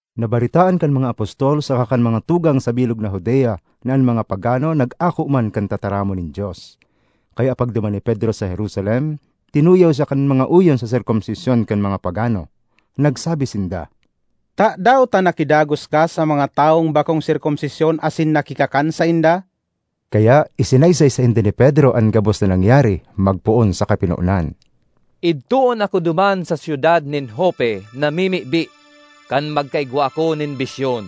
Nabaretaan kan mga apostol saka kan mga tugang sa bilog na Judea na an mga pagano nag-ako man kan tataramon nin Dios. Kaya pagduman ni Pedro sa Jerusalem, tinuyaw siya kan mga oyon sa serkomsisyon kan mga pagano. Nagsabi sinda, “Tadaw ta nakidagos ka sa mga tawong bakong sirkomsisyon asin nakikakan sainda?” Kaya isinaysay sainda ni Pedro an gabos na nangyari, magpoon sa kapinonan: ”Idtoon ako duman sa syudad nin Jope namimibi, kan magkaigwa ako nin bisyon.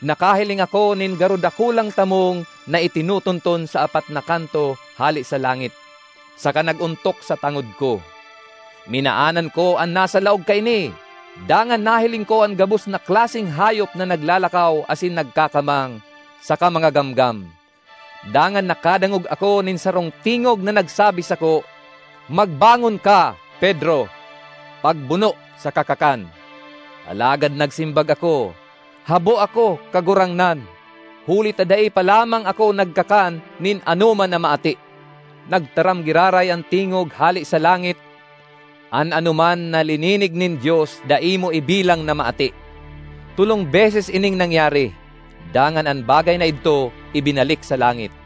Nakahiling ako nin garo dakulang tamong na itinutunton sa apat na kanto hale sa langit, saka nag-ontok sa tangod ko. Minaanan ko an nasa laog kaini, dangan nahiling ko an gabos na klaseng hayop na naglalakaw asin nagkakamang, saka mga gamgam. Dangan nakadangog ako nin sarong tingog na nagsabi sako, ‘Magbangon ka, Pedro; pagbuno saka kakan!’ Alagad nagsimbag ako, ‘Habo ako, Kagurangnan! Huli ta dai pa lamang ako nagkakan nin anoman na maati.’ Nagtaram giraray an tingog hale sa langit, ‘An anoman na lininig nin Dios dai mo ibilang na maati.’ Tolong beses ining nangyari; dangan an bagay na idto ibinalik sa langit.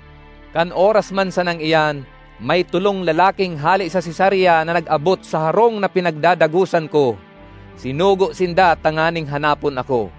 Kan oras man sanang iyan, may tolong lalaking hale sa Cesarea na nag-abot sa harong na pinagdadagosan ko. Sinugo sinda tanganing hanapon ako.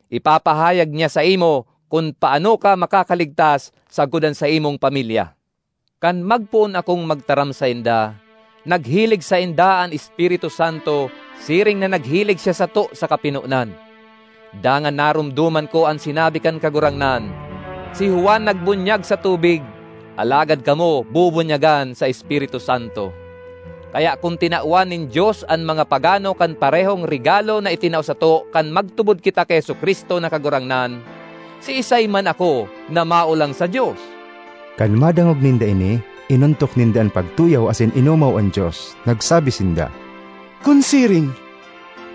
Ipapahayag niya saimo kun paano ka makakaligtas sagkod an saimong pamilya.’ Kan magpoon akong magtaram sainda, naghilig sainda an Espiritu Santo siring na naghilig siya sato sa kapinonan. Dangan naromdoman ko an sinabi kan Kagurangnan, ‘Si Juan nagbunyag sa tubig, alagad kamo bubunyagan sa Espiritu Santo.’ Kaya kun tinawan nin Dios an mga pagano kan parehong regalo na itinao sato kan magtubod kita ki Jesu-Cristo na Kagurangnan, siisay man ako na maolang sa Dios?” Kan madangog ninda ini, inontok ninda an pagtuyaw asin inomaw an Dios. Nagsabi sinda, “Kun siring,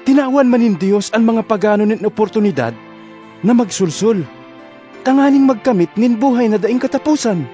tinawan man nin Dios an mga pagano nin oportunidad na magsolsol tanganing magkamit nin buhay na daing kataposan!”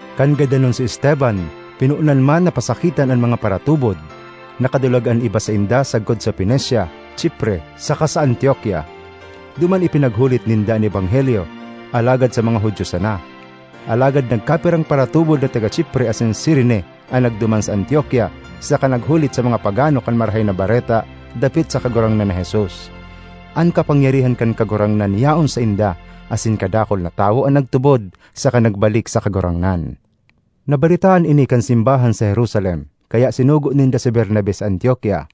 Kan gadanon si Esteban, pinonan man na pasakitan an mga paratubod. Nakadulag an iba sainda sagkod sa Fenecia, Chipre saka sa Antiokia; duman ipinaghulit ninda an ebanghelyo, alagad sa mga Judio sana. Alagad nagkapirang paratubod na taga Chipre asin Cirene an nagduman sa Antiokia saka naghulit sa mga pagano kan Marahay na Bareta dapit sa Kagurangnan na Jesus. An kapangyarihan kan Kagurangnan yaon sainda, asin kadakul na tawo an nagtubod saka nagbalik sa Kagurangnan. Nabaretaan ini kan simbahan sa Jerusalem, kaya sinugo ninda si Bernabe sa Antiokia.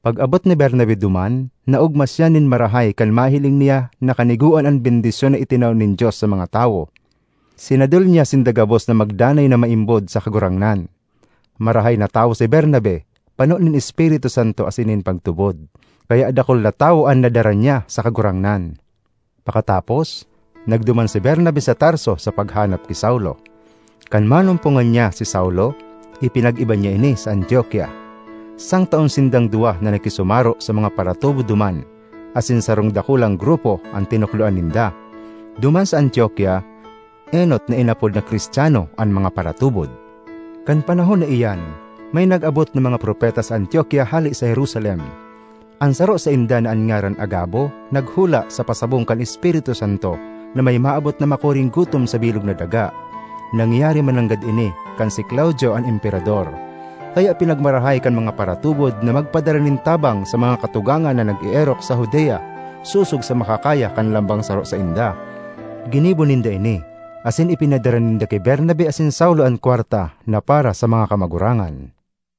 Pag-abot ni Bernabe duman, naogma siya nin marahay kan mahiling niya na kanigoan an bendisyon na itinao nin Dios sa mga tawo. Sinadol niya sinda gabos na magdanay na maimbod sa Kagurangnan. Marahay na tawo si Bernabe, pano nin Espiritu Santo asin nin pagtubod. Kaya dakul na tawo an nadara niya sa Kagurangnan. Pakatapos, nagduman si Bernabe sa Tarso sa paghanap ki Saulo. Kan manumpongan niya si Saulo, ipinag-iba niya ini sa Antiokia. Sangtaon sindang duwa na nakisumaro sa mga paratubod duman asin sarong dakulang grupo an tinukdoan ninda. Duman sa Antiokia enot na inapod na Cristiano an mga paratubod. Kan panahon na iyan, may nag-abot na mga propeta sa Antiokia hale sa Jerusalem. An saro sainda, na an ngaran Agabo, naghula sa pasabong kan Espiritu Santo na may maabot na makuring gutom sa bilog na daga. (Nangyari mananggad ini kan si Claudio an Emperador.) Kaya pinagmarahay kan mga paratubod na magpadara nin tabang sa mga katugangan na nag-eerok sa Judea, sosog sa makakaya kan lambang saro sainda. Ginibo ninda ini, asin ipinadara ninda ki Bernabe asin Saulo an kwarta na para sa mga kamagurangan.